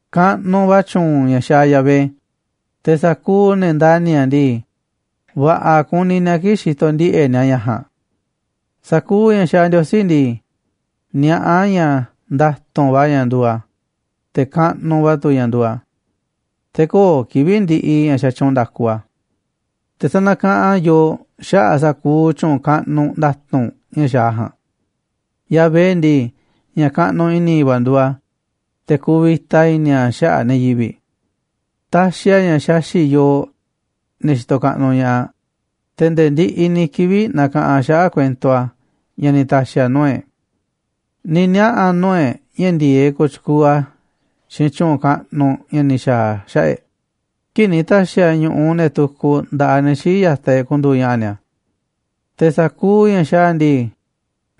Kaꞌnuꞌ va̱ tyu̱u̱n ña̱ xaaꞌ Yahvé, te̱ sa̱kuuꞌ ne̱ ndani̱ a̱ ndii, va̱ꞌa̱ kuni ni̱a̱ kii̱ꞌ xitoꞌ ndiꞌe̱ꞌ ni̱a̱ ña̱ ja̱a̱nꞌ. Sa̱kuuꞌ ña̱ xaaꞌ Ndiosí ndii, niaꞌá a̱ ña̱ nda̱tu̱nꞌ va̱ ña̱ nduuꞌ a̱, te̱ kaꞌnuꞌ va̱ tu̱ ña̱ nduuꞌ a̱, te̱ köo̱ꞌ kivi̱ꞌ ndiꞌiꞌ ña̱ xatyuunꞌ nda̱ku a̱. Te̱ sanakaꞌanꞌ a̱ yooꞌ xaꞌa̱ꞌ sa̱kuuꞌ tyu̱u̱n kaꞌnuꞌ nda̱tu̱nꞌ ña̱ xaaꞌ a̱ ja̱a̱nꞌ. Yahvé ndii, ña̱ kaꞌnuꞌ i̱ni̱ va̱ nduuꞌ a̱, te̱ kuvita i̱ni̱ a̱ xaꞌa̱ꞌ ne̱ yivi̱ꞌ. Taxiꞌ a̱ ña̱ xaxi̱ꞌ yooꞌ, ne̱ xitoꞌ kaꞌnuꞌ ña̱ꞌaꞌ, te̱ nde̱e̱ ndiꞌiꞌ ni̱ kivi̱ꞌ na̱ka̱ꞌanꞌ a̱ xaꞌa̱ꞌ kuento a̱ ña̱ ni̱ ta̱xi̱ a̱ nuu̱ꞌ e̱ꞌ. Ni̱ niaꞌa̱ nuu̱ꞌ e̱ꞌ ña̱ ndi̱e̱eꞌ kooꞌ tyukuuꞌ a̱ xiinꞌ tyu̱u̱n kaꞌnuꞌ ña̱ ni̱ xa̱a̱ a̱ xaꞌa̱ꞌ e̱ꞌ kii̱ꞌ ni̱ ta̱xi̱ a̱ ñu̱ꞌuꞌ ne̱ tukuꞌ nda̱ꞌaꞌ ne̱ xii̱ꞌ ya̱taꞌ e̱ꞌ ku̱ndu̱u̱ ña̱ꞌa̱ ni̱a̱. Te̱ sa̱kuuꞌ ña̱ xaaꞌ a̱ ndii,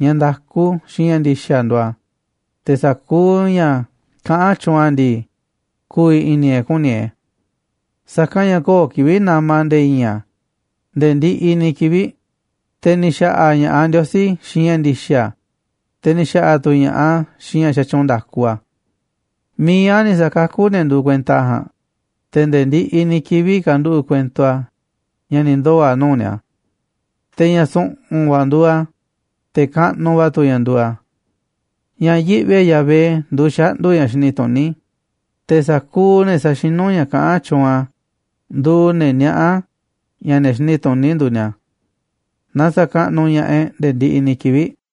ña̱ nda̱ku xiinꞌ ña̱ ndi̱xa̱ nduuꞌ a̱, te̱ sa̱kuuꞌ ña̱ kaꞌán tyuunꞌ a̱ ndii, ku̱vi̱ i̱ni̱ e̱ꞌ ku̱ni̱ e̱ꞌ e̱. Sa̱kanꞌ ña̱ köo̱ꞌ kivi̱ꞌ nama̱ nde̱e̱ i̱i̱n a̱ nde̱e̱ ndiꞌiꞌ ni̱ kivi̱ꞌ, te̱ ni̱ xa̱ꞌa̱ ña̱ꞌaꞌ Ndiosí xiinꞌ ña̱ ndi̱xa̱, te̱ ni̱ xa̱ꞌa̱ tu̱ ña̱ꞌaꞌ a̱ xiinꞌ ña̱ xatyuunꞌ nda̱ku a̱. Mi̱iꞌ a̱ ni̱ sa̱kakú a̱ ne̱ nduuꞌ kuenta a̱ ja̱a̱nꞌ, te̱ nde̱e̱ ndiꞌiꞌ ni̱ kivi̱ꞌ ka̱nduꞌu̱ꞌ kuento a̱ ña̱ ni̱ ndoo̱ a̱ nuu̱ꞌ ni̱a̱. Te̱ ña̱ su̱ꞌu̱n va̱ nduuꞌ a̱, te̱ kaꞌnuꞌ va̱ tu̱ ña̱ nduuꞌ a̱. Ña̱ yiꞌvi e̱ꞌ Yahvé nduuꞌ xaꞌndu̱ ña̱ xini tuní, te̱ sa̱kuuꞌ ne̱ saxinú ña̱ kaꞌán tyuunꞌ a̱ nduuꞌ ne̱ niaꞌá ña̱ ne̱ xini tuní nduuꞌ ni̱a̱. Na sa̱kaꞌnuꞌ ña̱ꞌaꞌ e̱ꞌ nde̱e̱ ndiꞌiꞌ ni̱ kivi̱ꞌ.